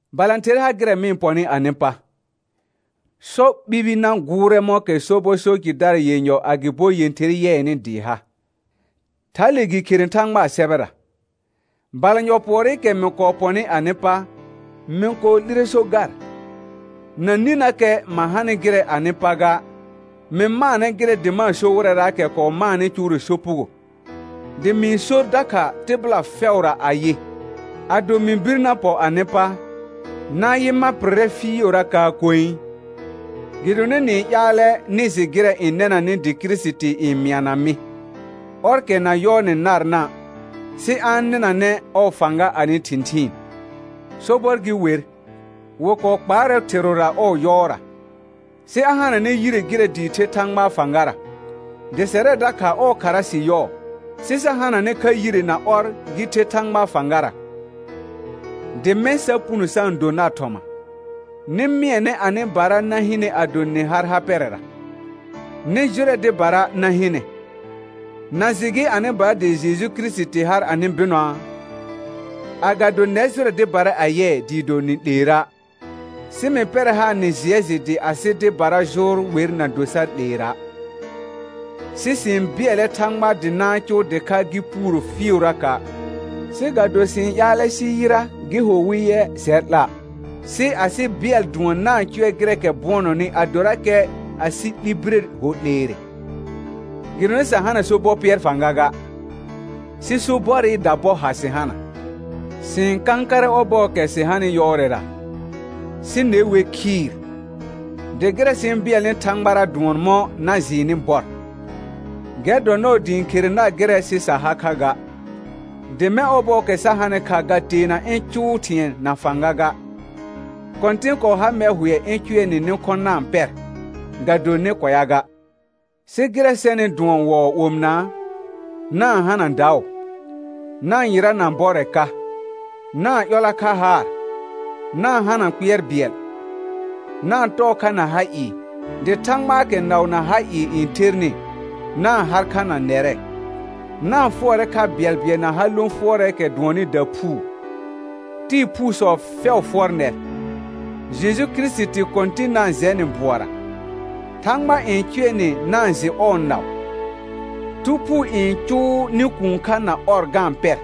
Balãther ha gɩrɛ mɩ-n pɔnɩ anɩ pa. «Sɔ ɓibi na gʋʋrɛ mɔ̃kɛ sobɔ so jɩdara yenyɔ agɩbo yẽther yɩɛnɩ dɩɩ ha», thale gɩ khere Thãgbaa sɛbɛra. Balanyɔ pʋɔrɩkɛ mɩ kɔɔ pɔnɩ anɩ pa, mɩ kɔɔ 'lire so gar, na ninəkɛ ma hanɩ gɩrɛ anɩ pa ga, mɩ maanɛ gɩrɛ dɩ ma-n so wɩrɛraakɛ kɔɔ maanɩ cʋʋrɛ sopugo, dɩ mɩ-n sor dakha tɩbɩla fɛʋra ayɩ: Ado mɩ bir na pɔ anɩ pa, na-n yɩ ma pɩrrɛ fɩɩʋrakaa koe. Gɩdonɩ nɩ-n ƴaalɛ nɩ jɩ gɩrɛ n nɛnanɩ dɩ Kirisiti n mɩana mɩ, ɔrkɛ na yɔɔnɛ narna', sɩ a-n nɩnanɛ ɔɔ fãga anɩ thɩ̃thɩɩn. Sobɔr gɩ wer, wɩ kɔɔ kpaarɛ thɩrʋra ɔɔ yɔɔra, sɩ a hananɛ yire gɩrɛ dɩɩ the Thãgbaa fãgara. Dɩ sɛrɛ dakha ɔɔ khara sɩ yɔɔ, sɩ sa hananɛ kha yire na ɔr gɩ the Thãgbaa fãgara, dɩ mɛ̃ sa puno sa-n do nar thɔma. Nɩ mɩɛnɛ anɩbara na hɩnɛ ado nɩ har ha pɛrɛra, nɩ jʋrɛ dɩbara na hɩnɛ. Na jɩ gɩ anɩbara dɩ Jeju Kirisiti har anɩ bɩnɔaa? Agado nɛr jʋrɛ dɩbara a yɩɛ dɩɩ do nɩ 'leera'. Sɩ mɩ pɛrɛ haar nɩ jɩɛ jɩ dɩ asɩ dɩbara jʋʋr wer na do sar 'leera'. Sɩ sɩ-n bɩɛlɛ Thãgba dɩ na-n cʋʋ dɩkha gɩ puuro fɩɩʋraka', sɩ ga do sɩ-n ƴaalɛ sɩ yɩra gɩ ho wɩ yɛ sɛr 'la', sɩ asɩ bɩɛl dʋɔn na-n cʋɛ gɩrɛɛkɛ bʋɔnɔnɩ adorakɛ asɩ 'li bire ho 'leere. Gɩdonɩ sa hana sobɔ pɩɛr fãga ga, sɩ sobɔrɩ dabɔ ha sɩ hana. Sɩ-n kãkarɛ ɔbɔɔkɛ sɩ hanɩ yɔɔrɛra, sɩ ne wer khɩɩr. Dɩ gɩrɛ sɩ-n bɩɛlnɩ Thãgbara dʋɔn mɔ̃ na jɩɩnɩ bɔr. Gɛr dɔ nɔɔ dɩ ɩ̃ khere nar gɩrɛ sɩ sa ha kha ga, dɩ mɛ̃ ɔbɔɔkɛ sa hanɩ kha ga teena ɩ̃ cʋʋ thɩ̃ɛ na fãga ga. Kɔ̃tɩn kɔɔ ha mɛr hʋɛ ɩ̃ cʋɛ nɩ nɩ khɔ̃ na-n pɛr, ga do nɩ kʋɛa ga. Sɩ gɩrɛ sɛnɩ dʋɔn wɔɔ omɩnaa, na-n hana daʋ, na-n yɩrana bɔrɛ ka, na-n ƴɔla kha haar, na-n hana kpɩɛr bɩɛl, na-n tɔɔ kha na ha ɩɩ, dɩ Thãgbaakɛ naʋ na ha ɩɩ n thernɩ, na-n har kha na nɛrɛ. Na-n fʋɔrɛ kha bɩɛlbɩɛl na ha lõ fʋɔrɛɛkɛ dʋɔnnɩ daphuu. Tɩɩ phuusɔ fɛʋ fʋɔr nɛr. Jeju Kirisiti Kɔ̃tɩn na-n jɛ nɩ bʋɔra, Thãgba n cʋɛ nɩ na-n jɩ ɔɔ naʋ, Thu Phuu n cʋʋ nɩ kũu kha na ɔr ga-n pɛr;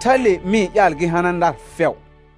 thale mɩ-n ƴaal gɩ hana nar fɛʋ.